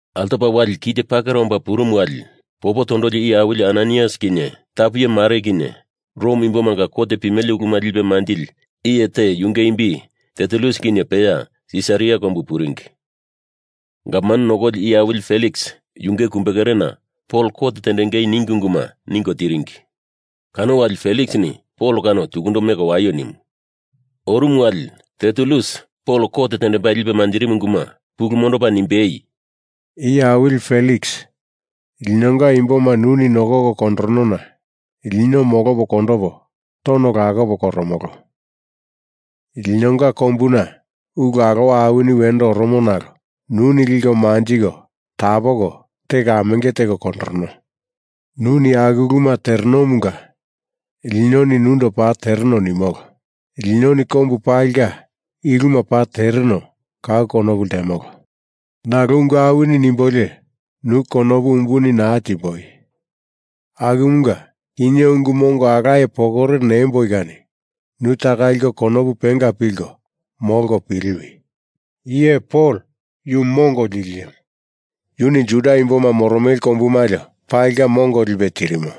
Altopa wali kite pakera omba purumu wali popo tondoli iye awili Ananaias kinye tapu iye mare kinye Rom imbomanga kot pimele uluma lipe manjili iye te yunge imbi Tertulus kinye peya Sisaria kombu puringi. Gavman nokoli iye awili Feliks yunge kumbekerena Pol kot tendengei ningi unguma ningo tiringi. Kano wali Feliksini Pol kano tukundo meko waio nimu. Orumu wali Tertulus Pol kot tendembai lipe manjirimu unguma pulu mondopa nimbei, “Iye awili Feliks, linonga imboma nuni nokoko kondoronona lino molopo kondopo tono lakopo koromolo. Linonga kombuna ulu alowa awini wendo oromo nalo nuni liko manjiko tapoko teko amenge teko kondorono. Nuni aku uluma terenomunga linoni nundo paa tereno nimolo. Linoni kombu palinga i uluma paa tereno kau konopu ltemolo. Nalo ungu awini nimbolio nu konopu umbuni naa timboi. Akumunga kinye ungu mongo alaye pokore nemboi kani nu taka liko konopu penga pilko molko piliwi. I iye Pol, yu mongo lili iyemu. Yuni Juda imboma moromele kombu malio palinga mongo lipe tirimo.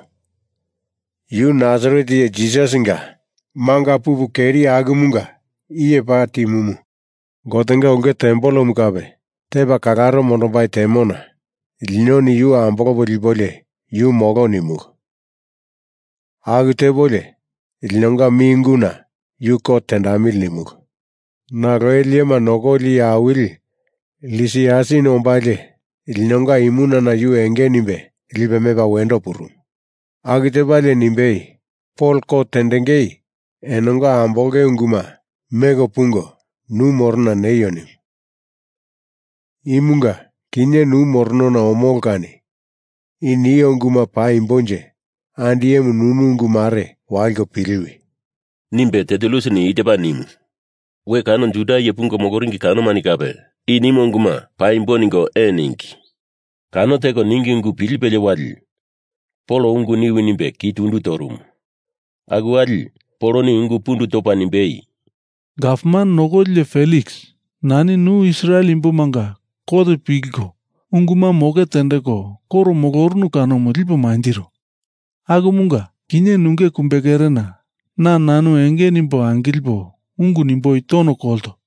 Yu Nasaret iye Jisasinga manga pupu keri akumunga iye paa timumu. Gotenga ulke tempelemu kape tepa kalaro mondombai temona linoni yu ambolopo lipolio yu molo nimulu. Aku tepolio linonga mi unguna yu kot tendamili nimulu. Nalo ele iyema nokoli iye awili Lisiasini ombalie linonga imunana yu enge nimbe lipe mepa wendo purumu. Aku tepalie nimbei, Pol kot tendengei enonga ambolonge unguma meko pungo nu morona neio nimu. Imunga kinye nu moronona omolo. Kani i nio unguma paimbonje andi iyemu nunu ungu mare waliko piliwi,” nimbe Tertulus i tepa nimu. We kano Juda iye pungo moloringi kanomani kape i nimo unguma paimbo ningo ee ningi. Kano teko ningi ungu pilipelie wali Pol ungu niwi nimbe ki tundu torumu. Aku wali Poloni ungu pundu topa nimbei, “Gavman nokoli iye Feliks, nani nu Israel imbomanga kot pilko unguma moke tendeko koro molorunu kanomu lipo mantiro. Akumunga kinye nunge kumbekerena na nanu enge nimbo angilipo ungu nimboi tono kolto.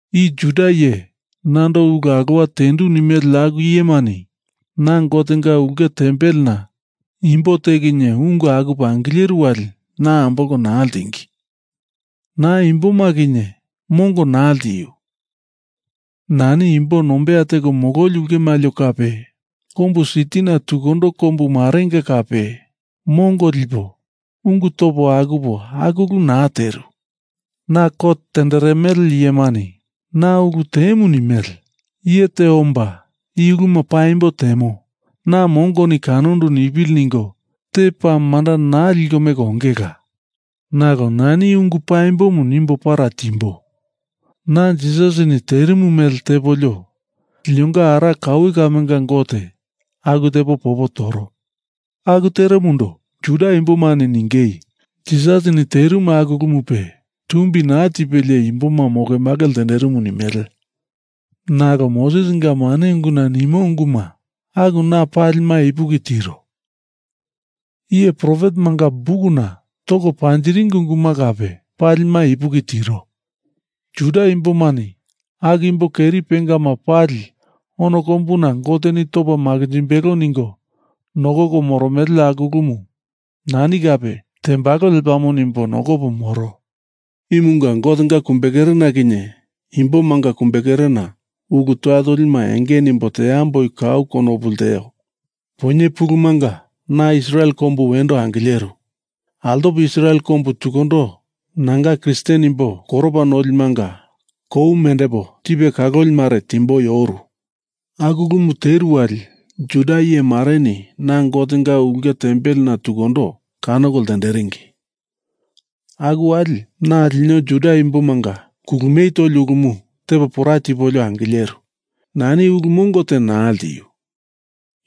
I Juda iye nando ulu alowa tendu nimele aku iyemani na Gotenga ulke tempelena imbo te kinye ungu akupo angileru wali na ambolko naa ltingi. Na imboma kinye mongo naa ltiu. Nani imbo nombeya teko mololi ulke malio kape kombu sitina tukundo kombu marenga kape mongo lipo, ungu topo akupo aku ulu naa teru. I kot tenderemele iyemani na ulu temu nimele iye te omba i uluma paa paimbo temo, na mongoni kanandu nipili ningo te paa manda naa liko meko ongela. Nalo nani i ungumu paimbo nimbo para timbo. Na Jisasini terimu mele tepolio linonga ara kaue kamenga Gote aku tepo popo toro. Aku teromundo Juda imbomani ningei Jisasini terimu aku ulumupe tumbi naa tipelie imboma mokemake ltenderimu nimele. Nalo Mosesinga mane unguna nimo unguma aku na palima ipuki tiro. Iye profetemanga bukuna toko panjiringi unguma kape palima ipuki tiro. Juda imbomani aku imbo keri pengama pali ono kombuna Goteni topa makinjimbelo ningo nokoko moromele aku ulumu nani kape tembalo lepamo nimbo nokopo moro. Imunga Gotenga kumbekerena kinye imbo imbomanga kumbekerena ulu toya tolima enge nimbo teamboi kau konopu lteo. Poinye pulumunga na Israel kombu wendo angileru. Altopo Israel kombu tukundo nanga Kristen imbo koropa nolimanga kou mendepo tipe kaloli mare timboi oru. Aku ulumu teru wali Juda iye mareni na Gotenga ulke tempelena tukundo kanoko ltenderingi. Aku wali na lino Juda imbomanga kulumie toli ulumu tepo pora tipolio angileru. Nani ulu mongo te naa ltiu.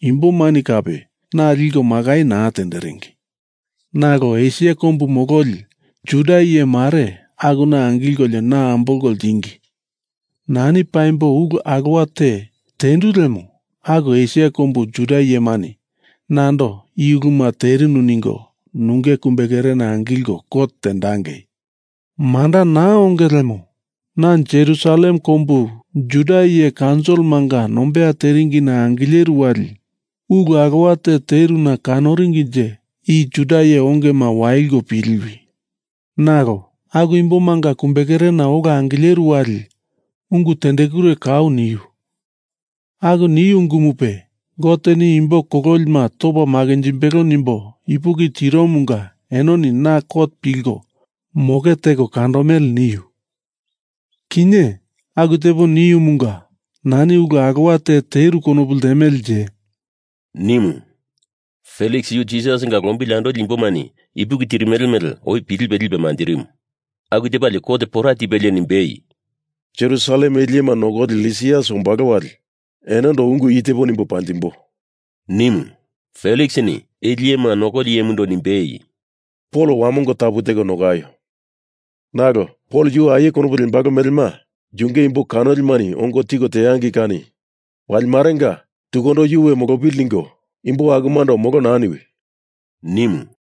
Imbomani kape naa liko makai naa tenderingi. Nalo Esia kombu mololi Juda iye mare akuna angilkolio na ambolko ltingi. Nani paimbo ulu alowa te tendu lemo aku Esia kombu Juda iyemani nando i uluma terinu ningo nunge kumbekerena angilko kot tendangei. Manda naa onge lemo, na Jerusalem Kombu Juda iye kaunsilimanga nombeya teringina angileru wali ulu alowa te teruna konoringinje i Juda iye ongema waliko piliwi. Nalo aku imbomanga kumbekerena ola angileru wali ungu tendekure kau niu. Aku niu ungumupe, Goteni imbo kololima topa makinjimbelo nimbo ipuki tiromunga enoni na kot pilko moke teko kandomele niu. Kinye aku tepo niumunga nani ulu alowa te teru konopu ltemelenje,” nimu. Feliks yu Jisasinga lombili andoli imbomani ipuki tirimele mele oi pilipe lipe manjirimu. Aku tepalie kot pora tipelie nimbei, “Jerusalem ele iyema nokoli Lisias ombalo wali enondo ungu i tepo nimbo panjimbo,” nimu. Feliksini ele iyema nokoli iyemundo nimbei, “Pol wamongo tapu teko nokaio. Nalo Pol yu aie konopu lembalo melema yunge imbo kanolimani ongo tiko teangei kani wali marenga tukundo yu we molopili ningo imbo akumando molo naa niwi,” nimu.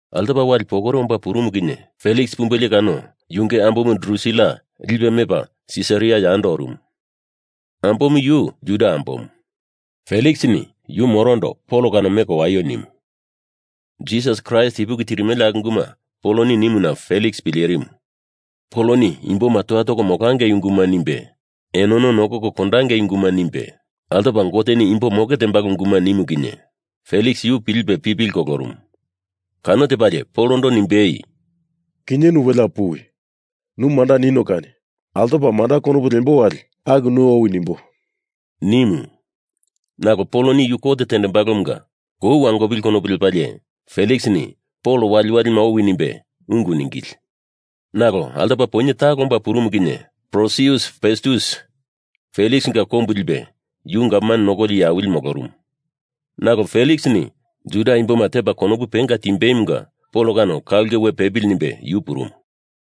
Altopa wali pokore omba purumu kinye Feliks pumbelie kano yunge ambomu Drusila lipe mepa Sisaria yando orumu. Ambomu yu Juda ambomu. Feliksini yu morondo Pol kano meko waio nimu. Jisas Kraist ipuki tirimele aku unguma Poloni nimuna Feliks pilerimu. Poloni imboma toya toko molangei unguma nimbe, enono nokoko kondangei unguma nimbe, altopa Goteni imbo moke tembalo unguma nimu kinye Feliks yu pilipe pipili kolorumu. Kano tepalie Polondo nimbei, “Kinye welea puwi. Nu manda nino kani altopa manda konopu lembo wali aku nu owi nimbo,” nimu. Nalo Poloni yu kot tembalomunga kou wangopili konopu lepalie Feliksini Pol waliwalima owi nimbe ungu ningili. Nalo altopa poinye talo omba purumu kinye Porsius Festus Feliksinga kombu lipe yu gavman nokoli iye awili molorumu. Nalo Feliksini Juda imboma tepa konopu penga timbeimunga Pol kano ka ulke we pepili nimbe yu purumu.